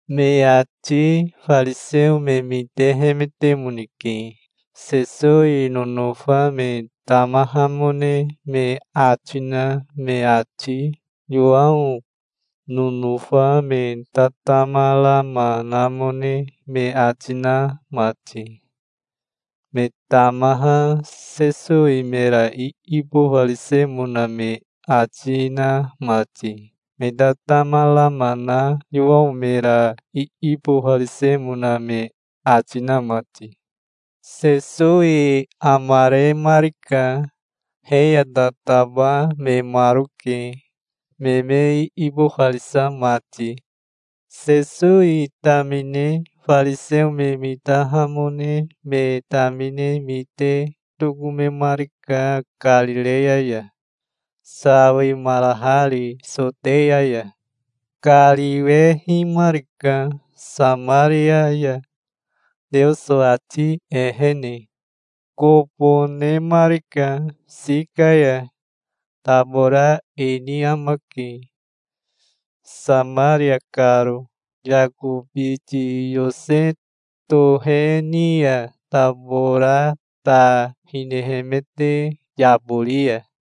Me ati fariseo me mitehemetemoneke, Sesowi nonofa me tamahamone me ati na me ati, Yowao nonofa me tatama rama namone me ati na mati, me tamaha Sesowi mera iibofarisemona me ati na mati, me tatama rama na Yowao mera iibofarisemona me ati na mati. Sesowi amaremarika. He ya tataba memaroke, me me iibofarisa mati. Sesowi tamine fariseo me mitahamone me tamine mite tokomemarika Karireya ya, sawimarahari Soteya ya. Kariwehimarika Samaria ya, Teoso ati ehene. Kobo nemarika Sika ya. Tabora ini amake, Samaria karo, Yako biti Yose tohe ni ya tabora ta hinehemete yabori ya.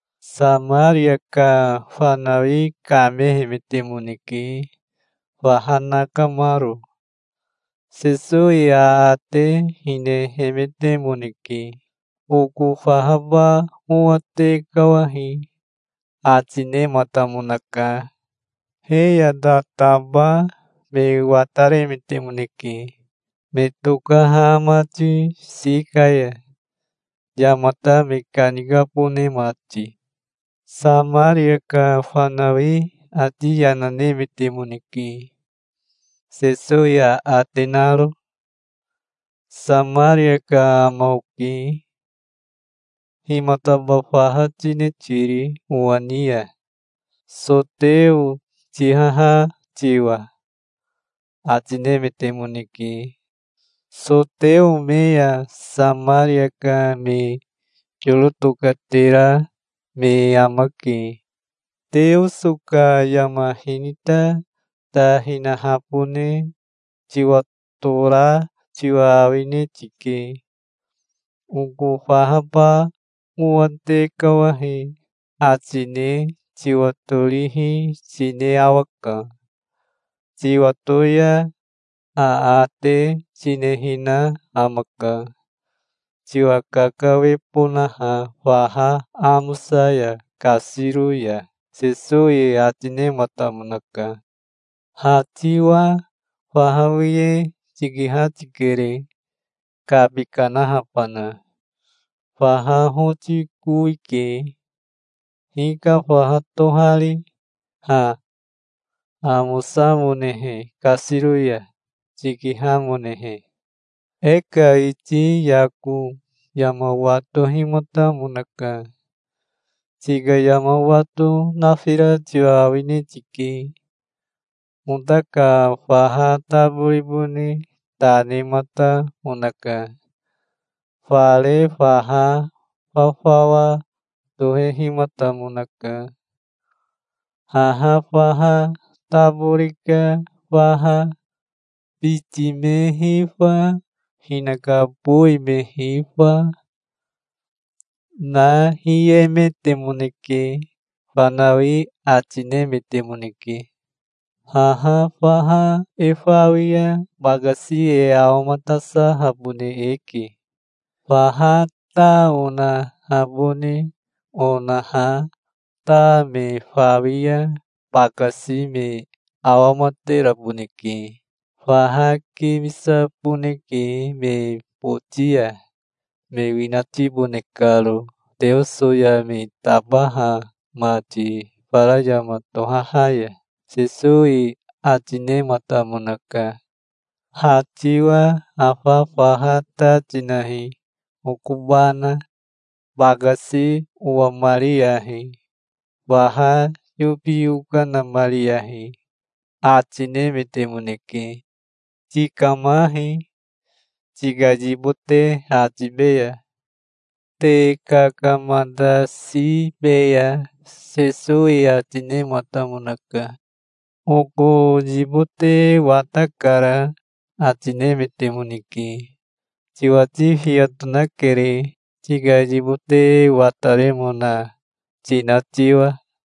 Samaria ka fanawi kamehemetemoneke faha nakamaro. Sesowi aate hinemetemoneke. "Oko fahaba owa tekawahi", ati nematamonaka. He ya tataba me wataremetemoneke, me tokaha mati Sika ya, yamata me kanikabone mati. Samaria ka fanawi ati yana nemetemoneke, Sesowi aate naro. "Samaria ka ama oke. Himataba faha tine tiri owa ni ya, soteo tihaha tiwa", ati nemetemoneke. (Soteo me ya Samaria ka me yoro tokatera me amake.) "Teoso ka yama hinita ta hinahabone tiwatora tiwa awine tike. Oko fahaba owa tekawahi ati ne tiwatorihi tine awaka. Tiwato ya aate tinehina amaka, tiwa kakawebonaha faha amosa ya kasiro ya", Sesowi ati nematamonaka. "Ha tiwa faha wiye tikiha tikere, kabi kanahabana. Faha hoti kowike. Hika faha tohari ha, amosamonehe kasiro ya, tikihamonehe? E ka iti Yako yama watohimatamonaka. Tika yama wato nafira tiwa awine tike. Ota ka faha taboribone ta nematamonaka. Fare faha fafawa tohehimatamonaka, haha faha tabori ka faha. Biti me hifa, hinaka bowi me hifa, na hiehemetemoneke", fanawi ati nemetemoneke. "Haha faha e fawi ya bakasi e awamatasahabone eke. Faha ta onahabone onaha ta me fawi ya bakasi me awamateraboneke. Faha kimisaboneke me boti ya, me winatibone karo Teoso ya me tabaha mati fara yama tohaha ya", Sesowi ati nematamonaka. "Ha tiwa afa faha ta tinahi okobana. Bakasi owamariyahi. Faha yobi okanamariyahi", ati nemetemoneke. "Tikamahi. Tika yibote ha tibeya. Te kakamatasibeya", Sesowi ati nematamonaka. "Oko yibote watakara', ati nemetemoneke. "Tiwati fiya tonakere, tika yibote wataremona tina tiwa.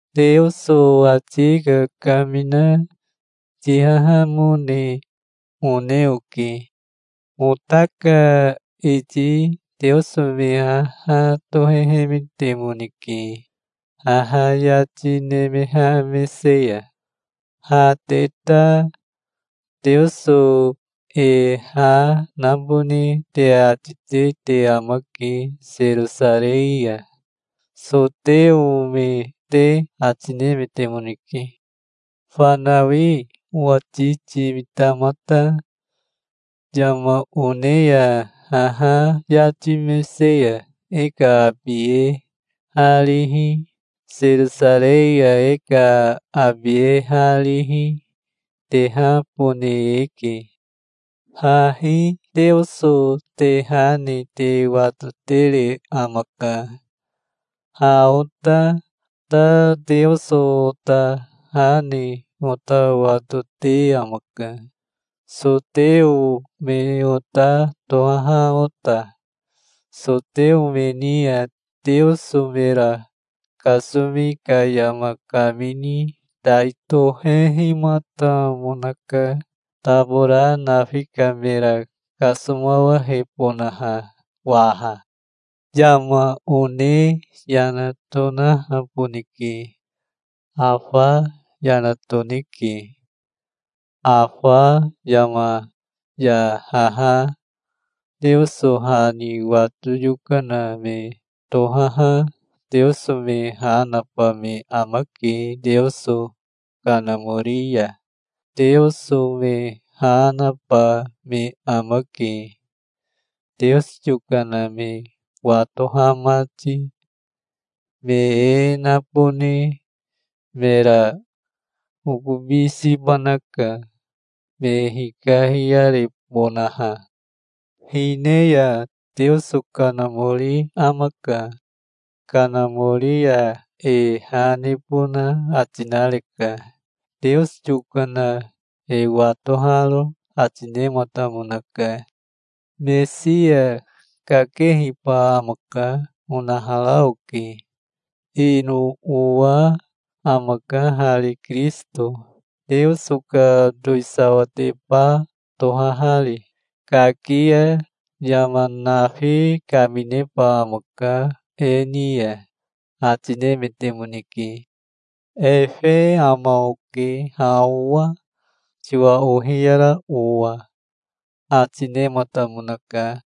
"Teoso ati kakamina tihahamone one oke. Ota ka iti Teoso me haha tohehemetemoneke haha yati nemeha mese ya. Ha te ta Teoso e ha nabone te ati te te amake Serosarei ya, soteo me te", ati nemetemoneke. "Fanawi owati timita mata. Yama one ya haha yati mese ya e ka abi e ha rihi, Serosarei ya e ka abi e ha rihi, tehabone eke. Hahi Teoso te ha ne te watotere amaka. Ha ota ta Teoso ota ha ne ota watote amaka, soteo me ota tohaha ota. Soteo me ni ya Teoso mera kasomi ka yama kamini tai tohehimatamonaka, tabora nafi ka mera kasomawahebonaha waha. Yama one yana tonahaboneke. Afa yana toneke. Afa yama ya haha Teoso ha ni wato yokana me tohaha Teoso me ha naba me amake Teoso Kanamori ya. Teoso me ha naba me amake, Teoso yokana me watoha mati. Me e nabone mera okobi siba naka, me hikahiyarebonaha. Hine ya Teoso Kanamori amaka. Kanamori ya e ha nebona ati nareka, Teoso yokana e watoharo", ati nematamonaka. "Mesia kakehiba amaka onahara oke. Ino owa amaka hari Kirisito, Teoso ka towisawateba tohahari. Kaki ya yama nafi kamineba amaka e ni ya", ati nemetemoneke. "Efe ama oke ha owa, tiwa ohiyara owa", ati nematamonaka.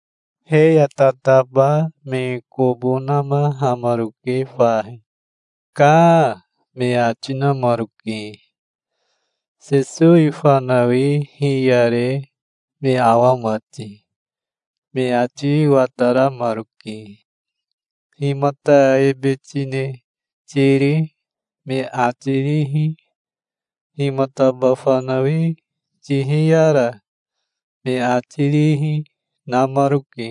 He ya tataba me kobo namahamaroke fahi. "Kaa", me ati namaroke, Sesowi fanawi hiyare me awa mati. Me ati wataramaroke. "Himata ebe tine tiri?" me ati rihi, "Himataba fanawi tihiyara?" me ati rihi, namaroke.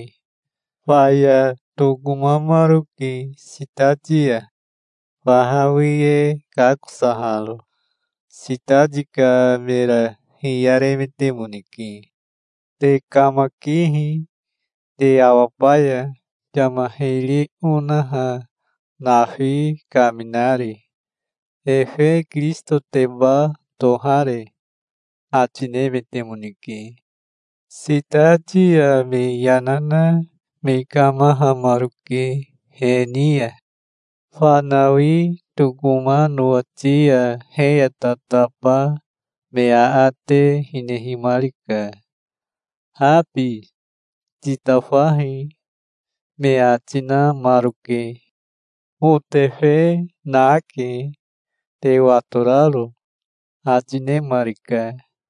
Faya tokomamaroke sitati ya, faha wiye kakosaharo. Sitati ka mera hiyaremetemoneke. "Te kamakihi. Te awabaya, yama hiri onaha nafi kaminari. Efe Kirisitoteba tohare?" ati nemetemoneke. Sitati ya me yana na me kamahamaroke he ni ya. Fanawi tokoma nowati ya he ya tataba me aate hinehimarika. "Habi titafahi", me ati namaroke. "Otefe nake, te watoraro", ati nemarika.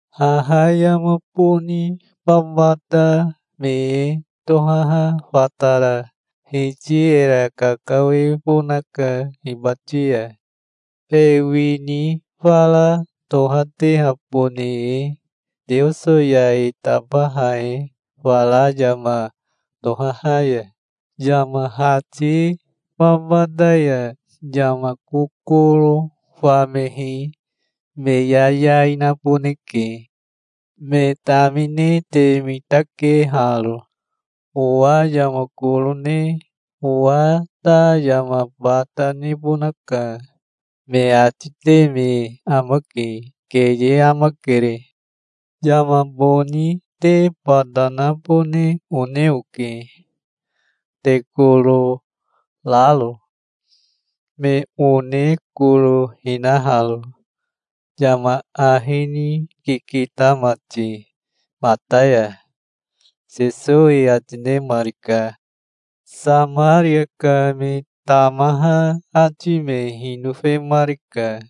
Haha yama boni babata me e tohaha fatara Hiti era kakawebonaka hibati ya, e wini fara tohatehabone e Teoso ya e tabaha e fara yama tohaha ya. Yama hati babata ya yama kokoro famehi me yayai naboneke. Me tamine te mitake haro. 'Owa yama koro ne owa ta yama bata nebonaka', me ati te me amake. Keye amakere. Yama boni te bata nabone one oke, te koro raro, me one koro hinaharo, yama ahi ni kikita mati mata ya", Sesowi ati nemarika. Samaria ka me tamaha ati me hinofemarika,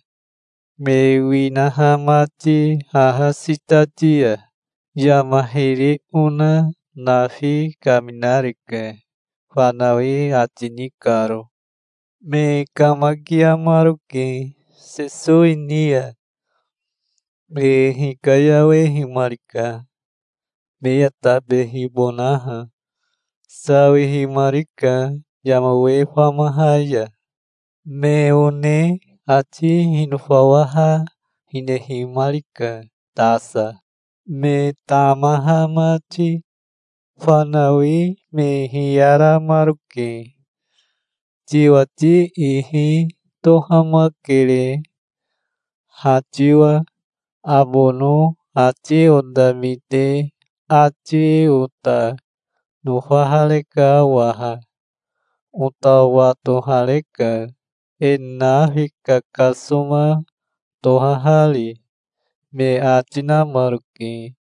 me winaha mati haha sitati ya, "Yama hiri ona nafi kaminareka", fanawi ati ni karo. Me kamakiamaroke Sesowi ni ya. Me hikayawehimarika, me ya tabehibonaha. Sawihimarika yama we famaha ya. Me one ati hinofawaha hinehimarika tasa, me tamaha mati. Fanawi me hiyaramaroke. "Tiwati ihi tohamakere, ha tiwa. Abono ati ota mite ati ota nofahareka waha. Ota watohareka, e nafi kakasoma tohahari", me ati namaroke.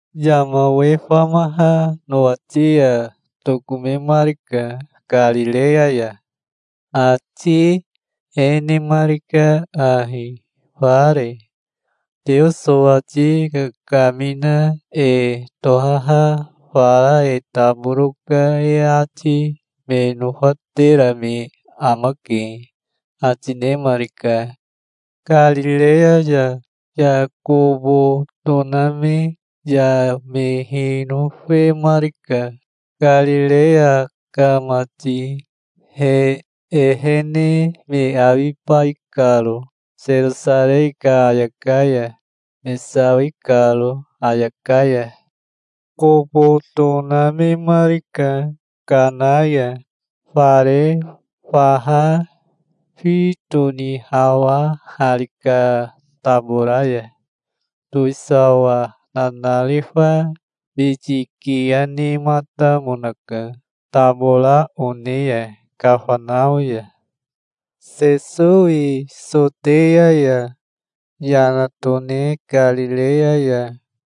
Yama we famaha nowati ya tokomemarika Karireya ya. Ati e nemarika ahi fare: "Teoso ati kakamina e tohaha fara e taboro ka e ati me nofatera me amake", ati nemarika. Karireya ya kobo toname ya me hinofemarika, Karireya ka mati, he ehene me awibai karo Serosarei ka ayaka ya, me sawi karo ayaka ya. Kobo tonamemarika Kana ya, fare faha fi tonihawahari ka tabora ya. Towisawa nanarifa biti kiya nematamonaka tabora one ya Kafanao ya. Sesowi Soteya ya yana tone Karireya ya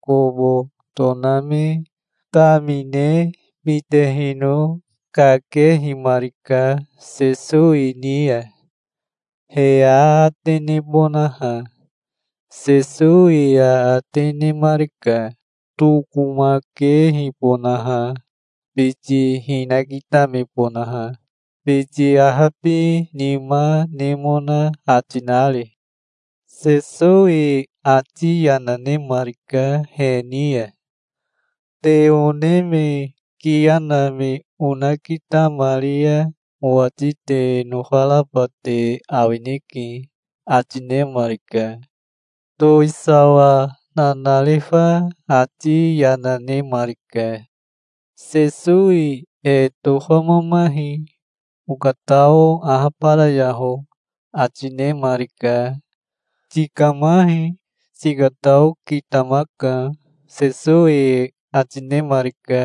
kobo toname tamine mitehino kakehimarika Sesowi ni ya, he aate nebonaha. Sesowi aate nemarika, tokomakehibonaha, biti hinakitamebonaha, biti ahabinima nemona ati nari. Sesowi ati yana nemarika he ni ya. "Te one me kiya na me onakitamari ya owati te nofaraba te awineke", ati nemarika. Towisawa nanarifa ati yana nemarika. "Sesowi e tofamamahi. Okatao ahabarayaho", ati nemarika. "Tikamahi. Tikatao kitamaka", Sesowi ati nemarika.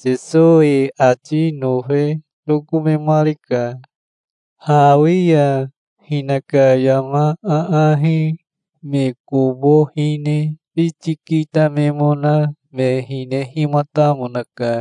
Sesowi ati nofe tokomemarika. Hawi ya hinaka yama aahi me kobo hine biti kitamemona me hinehimatamonaka.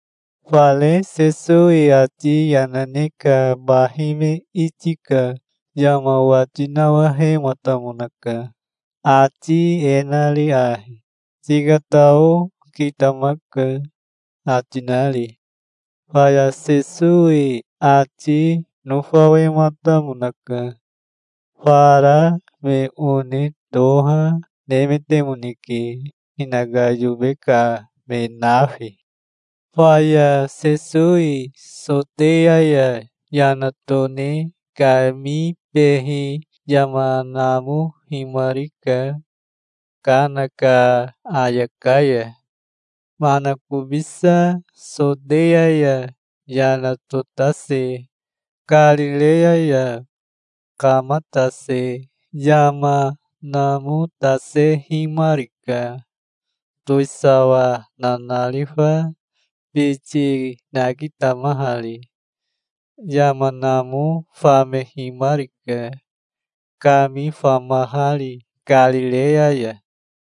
Fare Sesowi ati yana ne ka bahi me iti ka yama wati nawahematamonaka, ati e nari ahi, "Tikatao kitamaka", ati nari. Faya Sesowi ati nofawematamonaka. Fara me one toha nemetemoneke, hinaka yobe ka me nafi. Faya Sesowi Soteya ya yana tone kamibehi yama namohimarika Kana ka ayaka ya. Manakobisa Soteya ya yana totase Karireya ya kamatase yama namotasehimarika, towisawa nanarifa biti nakitamahari. Yama namo famehimarika, kami famahari Karireya ya.